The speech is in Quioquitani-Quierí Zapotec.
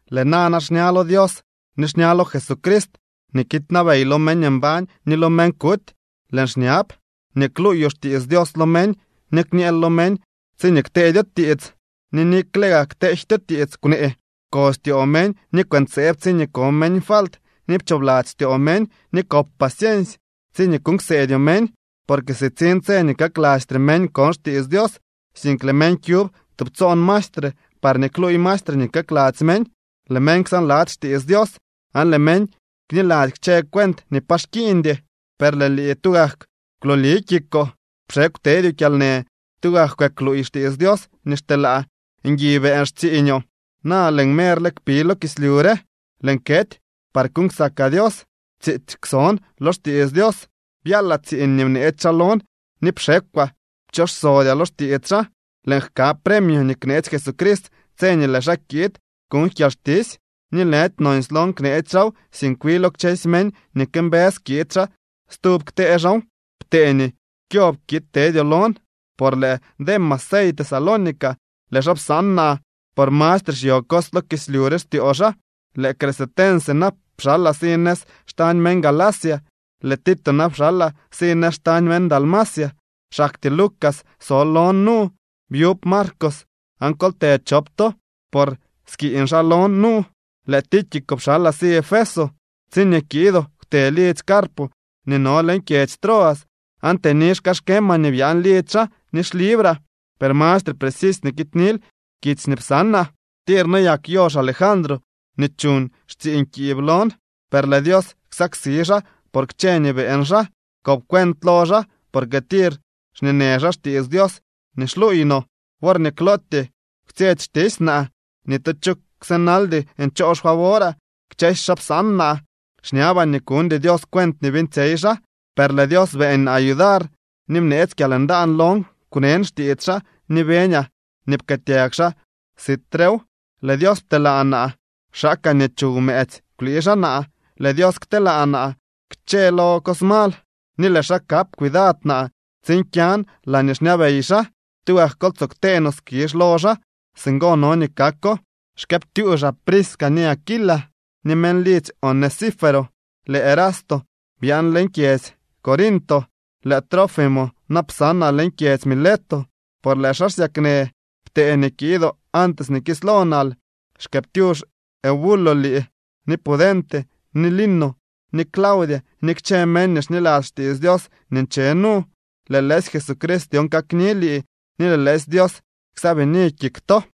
Lëë nana xña lo Dios ni xña lo Jesucrist nii kiidnabey lo meñ mbañ ni lo meñ kuty, lëën xñab nii kluuyoo xtiits Dios lo meñ, ni kñeel lo meñ tsiñee kteedyo tiits ni nikle gaa kteejtyo tiits kwnee. Pkostyoo meñ ni kwëntseeb tsiñee ko meñ falt, ni pchoobladzy styoo meñ, ni kop paciensy tsiñee kuuñ kseedyoo meñ. Porque sitsiñ tse nii kaklastre meñ kon xtiits Dios. Sink lëë meñ kyub tubtsoon maestre parñee kluuy maestre nii kakladzy meñ. Lëë meñ ksaanladzy xtiits Dios aan lëë meñ kniladzy kchë cuent nii pa xkiiñdy. Per lëë lii tugak kwlooli kikoo, pxekw tedyoo kyalnë, tugak kwëkluuy xtiits Dios nii xteelaa. Ngui beeñ xtsiiñoo. Na lëën merle kpi lo kislyu re, lëën kety par kuuñ ksakaa Dios. Tsiitsy kwson lo xtiits Dios, byaalaa tsiiñ nii bneetsy xaa lon, ni pxekwaa pchooxsodyaa lo xtiits xaa. Lëën jka premio nii kneetsy Jesucrist tse nii lëë xaa kiid kuñ kyalxtisy. Ni lëdy nonsy lon kneetsy xaaw, sink wi lo kchësy meñ nii këmbës kiid xaa stub ktee xaaw. Ptee nii kyob kiid tedyoo lon. Por lëë Demas sey Tesalónica, lëë xaa psaan naa por mastre xyo cos lo kislyu re styoo xaa. Lëë Crescente na pxalaa si nëz xtañ meñ Galacia, lëë Tito na pxalaa si nëz xtañ meñ Dalmacia. Xaktyee Lucas so lon nu. Byub Marcos aan kol të chop to, por skiiñ xaa lon nu. Lëë Tíquico pxalaa si Efeso. Tsiñee kiidoo, kwte lidzy Carpo nii no leñ kyedzy Troas, aan tëni xkaxkemaa nii byaan lidzy xaa ni xlibraa, per mastre precisy nii kiidnil kitsy nii psanaa. Tir noyak yox Alejandro nii chuuñ xtsiiñ kiib lon, per lëë Dios ksaksi xaa por kchë nii beeñ xaa. Kop cuent lo xaa, porque tir xñeenë xaa xtiits Dios nii xluuy no. Worñee klootyee kwtsyetsy xtisy naa, ni tu cho kwsënaldy ncho xfavoraa. Kchësy xaa psaan naa. Xñabaa nii kuñdy Dios cuent nii beeñtsyey xaa. Per lëë Dios beeñ naa yudar ni bneetsy kyalndaan lon kwnen xtiits xaa ni beñaa nii pkëëtyag xaa sitrew. Lëë Dios pteelaa naa kwxaakaa nii chuw mëëtsy kwlii xaa naa. Lëë Dios kteelaa naa kchëlo cos mal, ni lëë xaa kap cuidad naa tsiin kyan laañee xñabey xaa. ¡Tugak kol tsoo ktee no skizh lo xaa! Singo no nii kako. Xkëëptyuuxaa Prisca ni Aquila, ni meñ lidzy Onesíforo. Lëë Erasto byaan leñ kyedzy Corinto, lëë Trófimo na psanaa leñ kyedzy Mileto por lëë xaa xsyaknë. Ptee nii kiidoo antes nii kislo nal. Xkëëptyuux Eubulo lii, ni Pudente, ni Lino, ni Claudia, ni kchë meñ nii xniladzy xtiits Dios nii nche nu. Lëë lëësy Jesucrist dyon kakni lii ni lëë lëësy Dios ksaabini kik to.